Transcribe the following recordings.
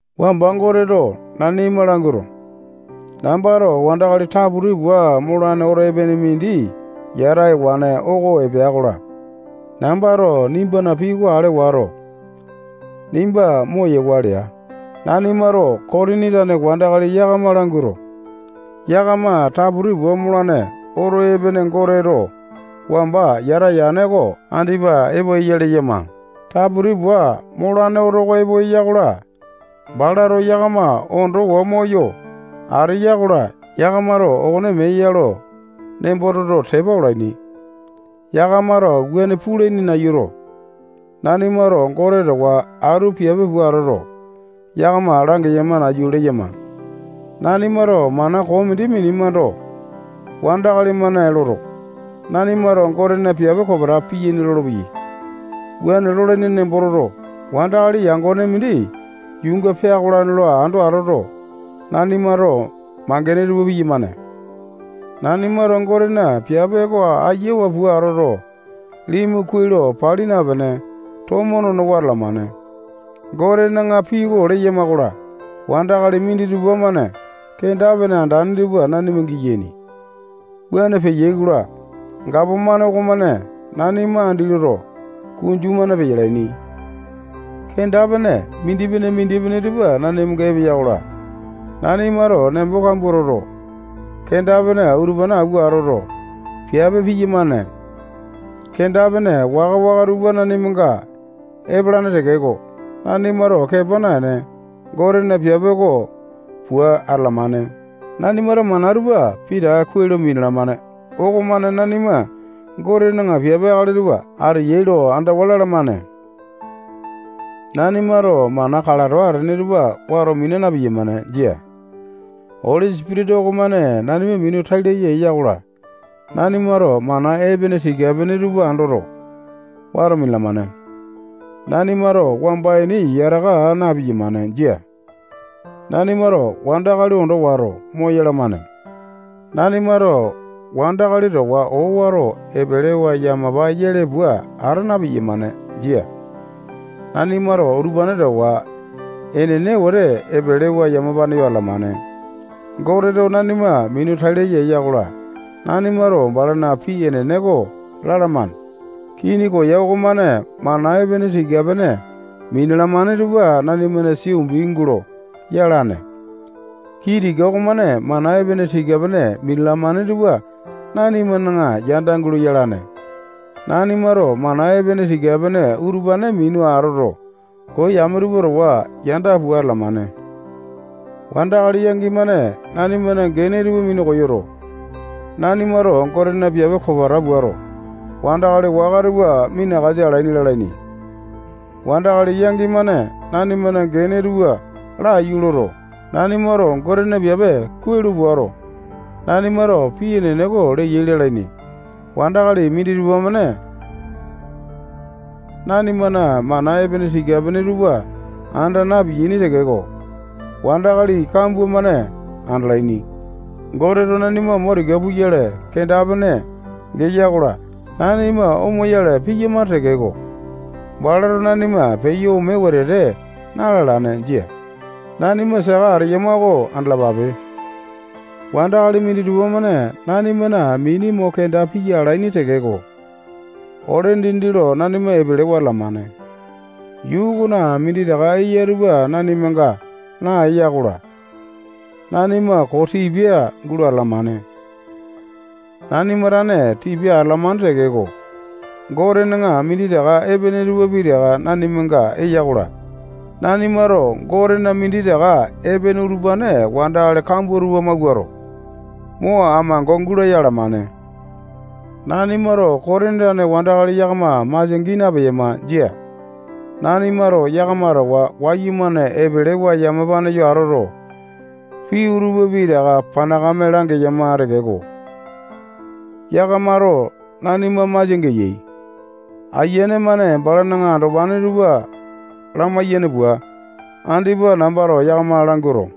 Wamba Goteto nanima languato, nambato wandakali taputi pua molane oto epene mindi yata ewane oko epea-kola, nambato nimbana pii oko ale wato, nimba moyewa lea. Nanimato Kotini tane wandakali yakama languato, yakama taputi pua molane oto epene Goteto wamba yata yane oko andipa epo eya leyama. Taputi pua molane oto oko epo eya-kola, balato yakama ondowa moyo ateya-kola, yakamato okone mee ya lo nembo toto, tepa olaini. Yakamato wuane pulaini nayuto, nanimato Gote towa atu piape pua atoto, yakama langeyama nayu leyama. Nanimato mana koo mindi minemando, wandakali-mane loto, nanimato Gotena piape kopeta piyaini lolopeyai. Wuane lolaini nembo toto, wandakali yangone mindi yuunga peakolane lo ando atoto, nanimato mangene tupa piyamane. Nanimato Gotena piape oko ayawa pua atoto, limu kuai lo pali napene, tomo nonowa atalamane. Gotena pii oko leyama-kola, wandakali minditupa-mane kenda-pene andane tupa nanima giyaini. Wuane peyai-kola, gapomane okomane nanima andi loto, kunju-mane peyalaini. Kenda-pene mindipene-mindipene tupa nanimanga epeya-kola, nanimato nembo kambua toto, kenda-pene utupane awua atoto, piape piyamane. Kenda-pene waka-waka tupa nanimanga epalane tekeko, nanimato kepa naene, Gotena piape oko pua atalamane. Nanimato mana tupa pitaka kuai lo minalamane okomane nanima Gotena piape akali tupa ateyai lo andawa lalamane. Nanimato mana kalato atane tupa wato mina na-piyamane. Jia. Oli Sipitisa okomane nanima minu tai laya eya-kola, nanimato mana epene tika-pene tupa andoto, wato minalamane. Nanimato wamba ini yataka aa na-piyamane. Jia. Nanimato wandakali ondo wato, moyalamane. Nanimato wandakali towa owato epelewa yamapa yele pua ata na-piyamane. Jia. Nanimato utupane towa enene wete epelewa yamapane yo atalamane. Goteto nanima minu tai laya eya-kola, nanimato balana pii enene oko lalamane. Kini koya okomane mana epene tika-pene minalamane tupa nanimana sia umbi gulo yalane. Kii tika okomane mana epene tika-pene minalamane tupa nanimana yanda gulo yalane. Nanimato mana epene tika-pene utupane minu atoto, koo yame tupa towa yanda pua atalamane. Wandakali yangi-mane nanimana gene tupa minu koyoto, nanimato Gotena piape kopeta puato, wandakali waka tupa minakasa alaini lalaini. Wandakali yangi-mane nanimana gene tupa laiyu loto, nanimato Gotena piape kuai lo puato, nanimato pii enene oko leyai lalaini. Wandakali minditupa-mane nanimana mana epene tika-pene tupa anda na-piyaini tekeko, wandakali kambua-mane andalaini. Goteto nanima mo tika puyale kenda-pene geya-kola, nanima omoyale piyamane tekeko, balato nanima peyo ome wetete na-lalane. Jia. Nanima saka ateyama oko andalapape. Wandakali minditupa-mane nanimana mini mo kenda piya alaini tekeko, ole dindi lo nanima epelewa atalamane. Yuu okona minditaka eya tupa nanimanaga naeya-kola, nanima koo tipia gulo atalamane. Nanima tane tipia atalamane tekeko, Gotena minditaka epene tupa pitaka nanimanga eya-kola, nanimato Gotena minditaka epene utupane wandakali kambua tupa mawuato, mo amango gulaya alamane. Nanimato Kotini tane wandakali yakama masia gii napeyama. Jia. Nanimato yakama towa wayumane epelewa yamapa yo atoto, pii utupa pitaka panakame langeyama tekeko, yakamato nanima masia geyai. Ayiane-mane balana andopane tupa lamaiyane pua, andipa nambato yakama languato,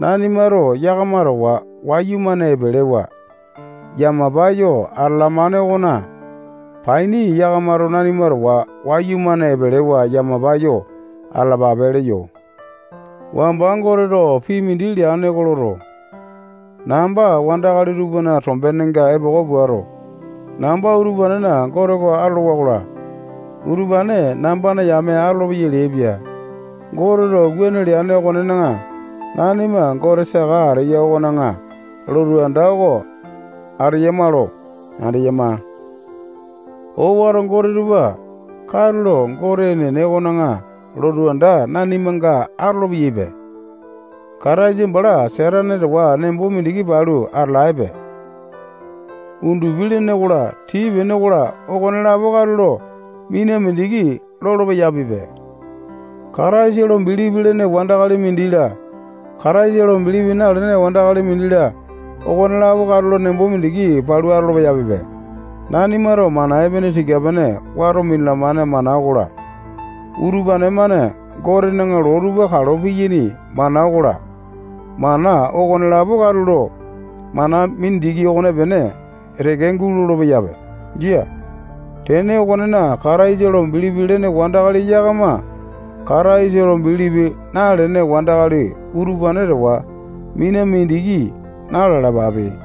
nanimato yakama towa wayumane epelewa yamapa yo atalamane okona paini yakamato nanima towa wayumane epelewa yamapa yo atalapape leyo. Wamba Goteto pii mindi leane oko loto, namba wandakali tupana tombenenga epoko puato, namba utupanena Gote oko atolowa-kola, utupane nambana yame atolopeyai leaipia. Goteto wuane leane okonena, nanima Gote saka ateya okona lotu anda oko ateyama lo andeyama. Owato gote tupa katulo Gote enene okona lotu anda nanimanga atolo-peyaipe. Kataisa bala Satane towa nembo mindiki palu atalaepe. Undupi-lene okola, tii-pene okola, okonelapo katulo mina mindiki lolo-peyapipe. Kataisa lo bilipi lene wandakali mindi-la, Kataisa lo bilipi nalene wandakali mindi-la, okonelapo katulo nembo mindiki palu atolo-peyapipe. Nanimato mana epene tika-pene wato minalamane mana okola, utupane-mane Gotena loo tupa kalo piyaini mana okola, mana okonelapo katulo mana mindiki okonepene teke gulolo-peyape. Jia. Tene okonena, Kataisa lo bilipi lene wandakali yakama Kataisa lo bilipi nalene wandakali utupane towa mina mindiki na-lalapape.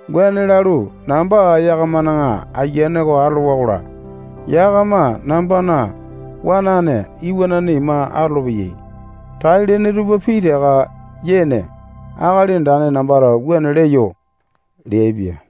Wuane lalu, namba yakamana ayiane oko atolowa-kola, yakama nambana wanane iwanane ima atolopeyai. Tai-lene tupa pitaka yene Akali Andane nambato wuane leyo leaipia.